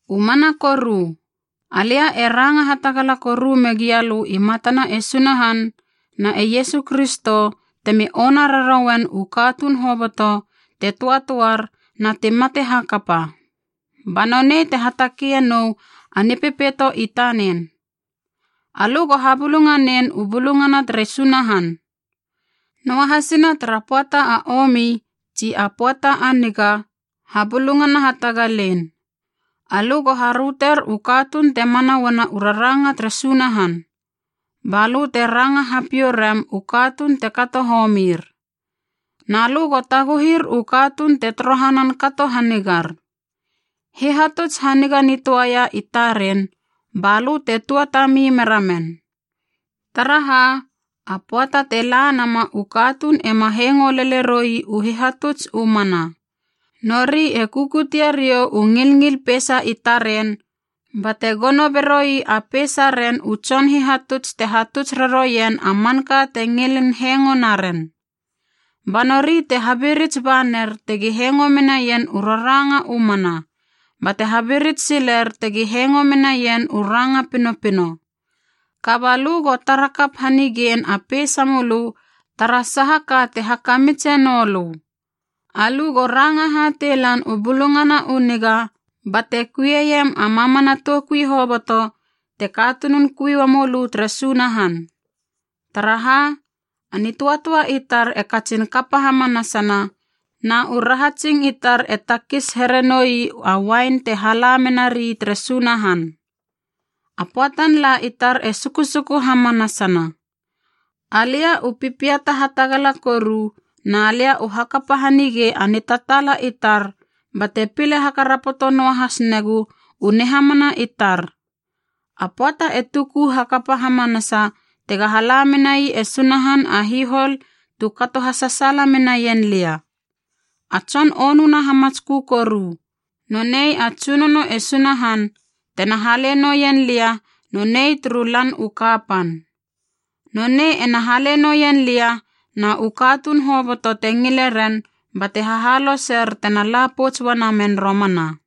U mana koru alia e ranga hatagala koru me gialö i matana e Sunahan na e Iesu Kristo temi ona rarouen u katuun hoboto te töatöar na ti mate hakapa, ba nonei te hatakeie nou a Nipepeito i tanen. Alö go habulunganein u bulungana tere Sunahan. Noahasina tara pöata a omi tsi a pöata a niga, habulungana hatagalein. Alö go haröter u katuun te mana uana u raranga tere Sunahan, balö te ranga hapiou rem u katuun te kato homir. Na lö go taguhir u katuun te torohanan kato hanigar. Hihatuts haniga nitöaia i taren, balö te tuatami mera men. Taraha, a pöata te la nama u katuun ema hengo lele roi u hihatuts u mana. Nori e kukutie riou u ngilngil peisa i taren, bate gono beroi a peisaren u tson hihatuts te hatuts raroien a manka te ngilin hengo naren. Ba nori te habirits ba ner tegi hengo menaien u raranga u mana, bate habirits siler tegi hengo menaien u ranga pinopino. Kaba lö go tara kap hanigein a peisa mölö tara saha ka te hakamitse noulö. Alö go ranga hatei lan u Bulungana u Niga bate kuieiem a mamana toukui hoboto te katunun kui ua mölö tere Sunahan. Taraha, a nitöatöa i tar e katsin kapa hamanasana na u rahatsing i tar e takis here noi a uain te hala menari tere Sunahan. A pöatan la i tar e sukusuku hamanasana. Alia u pipiata hatagala koru, na lia u hakapa hanigei a nitataala i tar bate pile hakarapoto noahas negu u nihamana i tar. A pöata e tuku hakapa hamanasa tega hala menai e Sunahan a hihol tu kato hasasaala menaien lia. A tson onuna hamatskö koru, nonei a Tsunono e Sunahan, tena hale noien lia nonei turu Lan u Kapan. Nonei ena hale noien lia na u katuun hoboto te ngile ren bate hahaloser tena la pouts uanamen romana.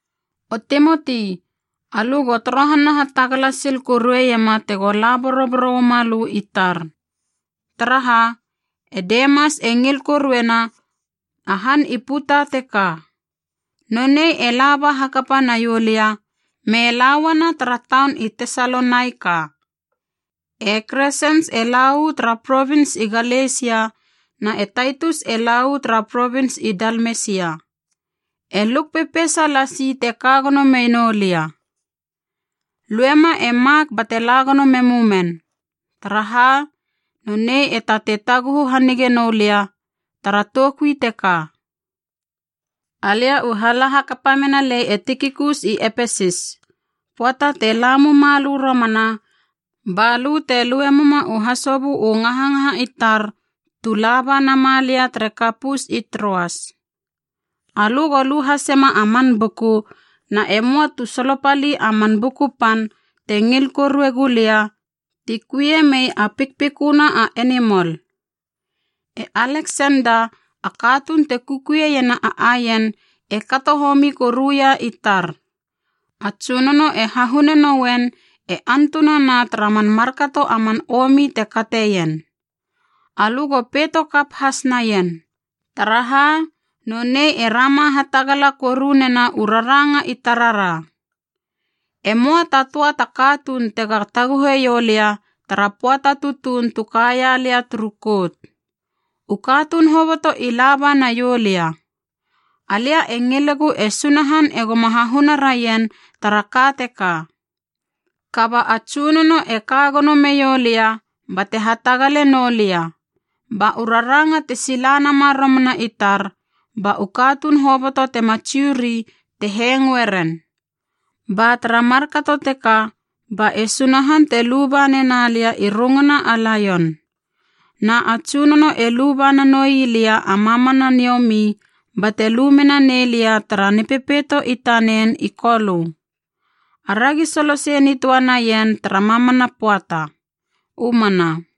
O Timoti, alö go torohana hatagala sil korueiema tego la boroboro uama lö i tar. Taraha, e Demas e ngil koruena a han i puta teka. Nonei e laba hakapa naiou lia me lauana tara taun i Tesalonaika. E Kresens e la uu tara provins i Galesia na e Taitus e la uu tara provins i Dalmesia. E Luk pepeisa lasi te ka gono menou lia. Luema e Mak bate la gono memu men, taraha, nonei te tatei taguhu hanige noulia tara toukui teka. Alia u hala hakapa menalei e Tikikus i Epesis. Pöata te la muma lö romana, balö te lue muma u hasobö u ngahangaha i tar tu laba nama lia tere Kapus i Troas. Alö go lu hasema a man buku, na e möa tu solopali a man buku pan te ngil korue gulia ti kuie mei a pikpiköna a enimol. E Aleksenda, a katuun te kukuieiena a aien, e kato homi koruia i tar. A Tsunono e hahune noen e antunana tara man markato a man omi te kateien. Alö go peito kap has naien, taraha nonei e rama hatagala korunena u raranga i tarara. E möa ta töa ta katuun tega taguheiou lia tara pöata tutuun tu kaia lia turu kout. U katuun hoboto i laba naiou lia. Alia e ngilegu e Sunahan egoma hahuna raien tara ka teka. Kaba a Tsunono e ka gono meiou lia bate hatagale noulia, ba u raranga te sila nama romana i tar, ba u katuun hoboto tema Jiu ri te hengoeren. Ba tara markato teka ba e Sunahan te luba nena lia i runguna a laion. Na a Tsunono e luba nanoi lia a mamana niomi bate lu mena nei lia tara Nipepeito i tanen i Kolö. Aragi solosei nitöa naien tara mamana pöata! U mana.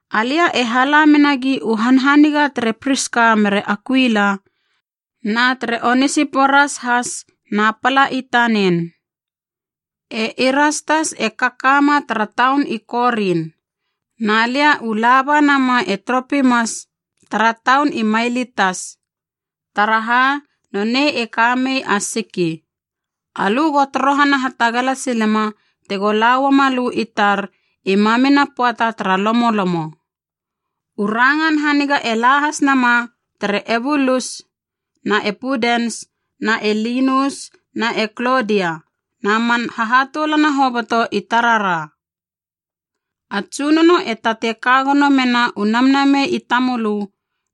Alia e hala menagi u hanhaniga tere Priska mere Akuila, na tere Onesiporas has na pala i tanen. E Irastas e kakama tara taun i Korin. Na lia u la ba nama e Tropimas tara taun i Mailitas, taraha nonei e ka mei a siki. Alö go torohana hatagala silema tego lauama lö i tar i mamina pöata tara lomolomo. U rangan haniga e la has nama tere Eubulus na e Pudens na e Linus na e Klodia, na man hahatoulana hoboto i tarara. A Tsunono e tatei ka gono mena u namnamei i tamölö,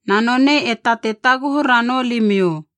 na nonei e tatei taguhu ranou limiou.